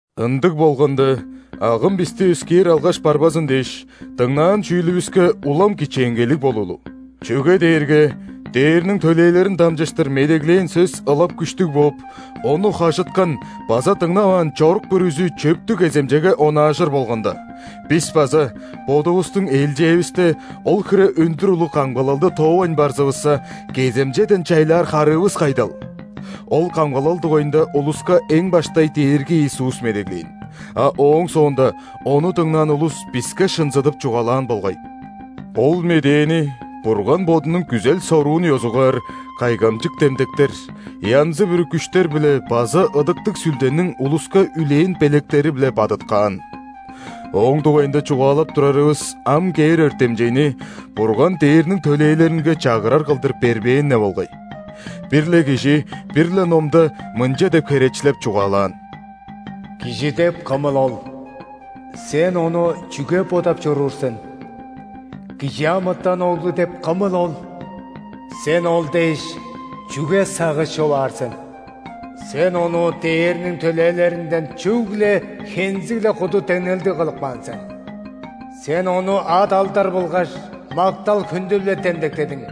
Ындыг болганда, агым бисти өскээр алгаш барбазын дээш, дыңнаан чүүлүвүске улам кичээнгейлиг болуулу. Чүге дээрге ·дээрниң төлээлерин дамчыштыр медеглээн сөс ылап күштүг бооп, ону хажыткан база дыңнаваан чорук бүрүзү чөптүг кеземчеге онаажыр болганда, бис база, бодувустуң ээлчээвисте, ол хире өндүр улуг камгалалды тоовайн барзывысса, кеземчеден чайлаар харыывыс кайдал? Ол камгалал дугайында улуска эң баштай Дээрги Иисус медеглээн, а ооң соонда Ону дыңнаан улус биске шынзыдып чугаалаан болгай. Ол медээни Бурган Бодунуң күзел-соруун ёзугаар кайгамчык демдектер, янзы-бүрү күштер-биле база Ыдыктыг Сүлдениң улуска үлээн белектери-биле бадыткаан. Ооң дугайында чугаалап турарывыс ам кээр өртемчейни Бурган ·дээрниң төлээлеринге чагырар кылдыр бербээн-не болгай. Бир-ле кижи бир-ле Номда мынча деп херечилеп чугаалаан:«Кижи деп кымыл ол, Сен ону чүге бодап чоруур сен?Кижи амытан оглу деп кымыл ол, Сен ол дээш чүге сагыш човаар сен? Сен ону дээрниң төлээлеринден чүгле хензиг-ле куду деңнелдигкылып каан сен.Сен ону ат-алдар болгаш мактал-хүндү-биле демдектедиң,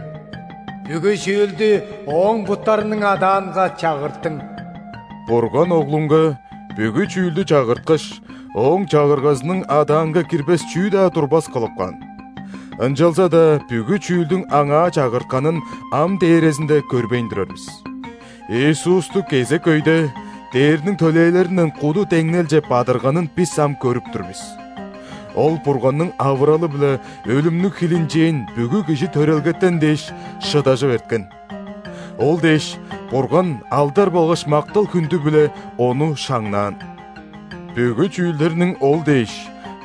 бүгү чүүлдү ооң буттарының адаанга чагырттың». Бурган Оглунга бүгү чүүлдү чагырткаш, Ооң чагыргазының адаанга кирбес чүү-даа турбас кылып каан. Ынчалза-даа бүгү чүүлдүң Аңаа чагыртканын ам дээрезинде көрбейн турар бис. Иисусту кезек өйдеR дээрниң төлээлеринден куду деңнелче бадырганын бис ам көрүп тур бис. Ол Бурганның авыралы-биле өлүмнүң хилинчээн бүгү кижи төрелгетен дээш, шыдажып эрткен. Ол дээш, Бурган алдар болгаш мактал-хүндү-биле Ону шаңнаан. Бүгү чүүлдерниң Ол дээш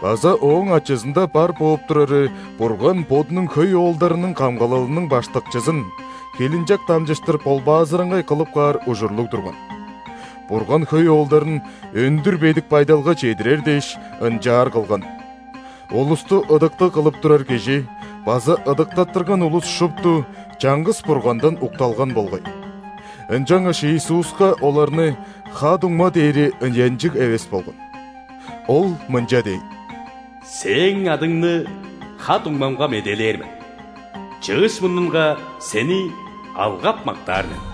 база Ооң ачызында бар бооп турары Бурган Бодунуң хөй оолдарының камгалалының Баштакчызын хилинчек дамчыштыр ·болбаазыраңгай кылып каар ужурлуг турган. Бурган хөй оолдарын өндүр бедик байдалга чедирер дээш, ынчаар кылган. Улусту ыдыктыг кылып турар Кижи база ыдыктаттырган улус шупту чаңгыс Бургандан укталган болгай. Ынчангаш Иисуска оларны «ха-дуңма» дээри ыянчыг эвес болган. Ол мынча дээн:«Сээң адыңны ха-дуңмамга медээлээр мен,чыыш мурнунга Сени алгап-мактаар мен».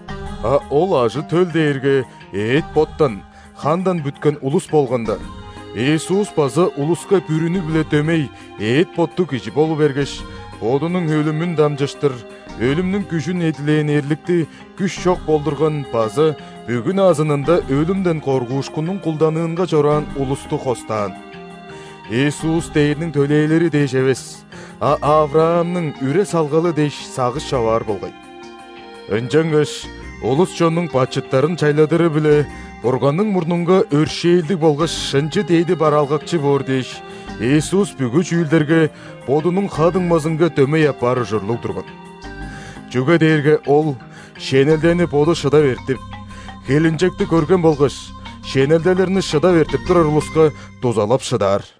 А ол ажы-төл дээрге эът-боттан, хандан бүткен улус болганда, Иисус база улуска бүрүнү-биле дөмей эът-боттуг кижи болу бергеш, Бодунуң өлүмүн дамчыштыр өлүмнүң күжүн эдилээн эрликти күш чок болдурган база бүгү назынында өлүмден коргуушкуннуң кулданыынга чораан улусту хостаан. Иисус ·дээрниң төлээлери дээш эвес, а ·Авраамның үре-салгалы дээш сагыш човаар болгай. Ынчангаш улус-чоннуң бачыттарын чайладыры-биле Бурганның мурнунга өршээлдиг болгаш шынчы дээди бараалгакчы боор дээш, Иисус бүгү чүүлдерге Бодунуң ха-дуңмазынга дөмей апаар ужурлуг турган. Чүге дээрге Ол, шенелдени Боду шыдап эртип, хилинчекти көрген болгаш, шенелделерни шыдап эртип турар улуска дузалап шыдаар.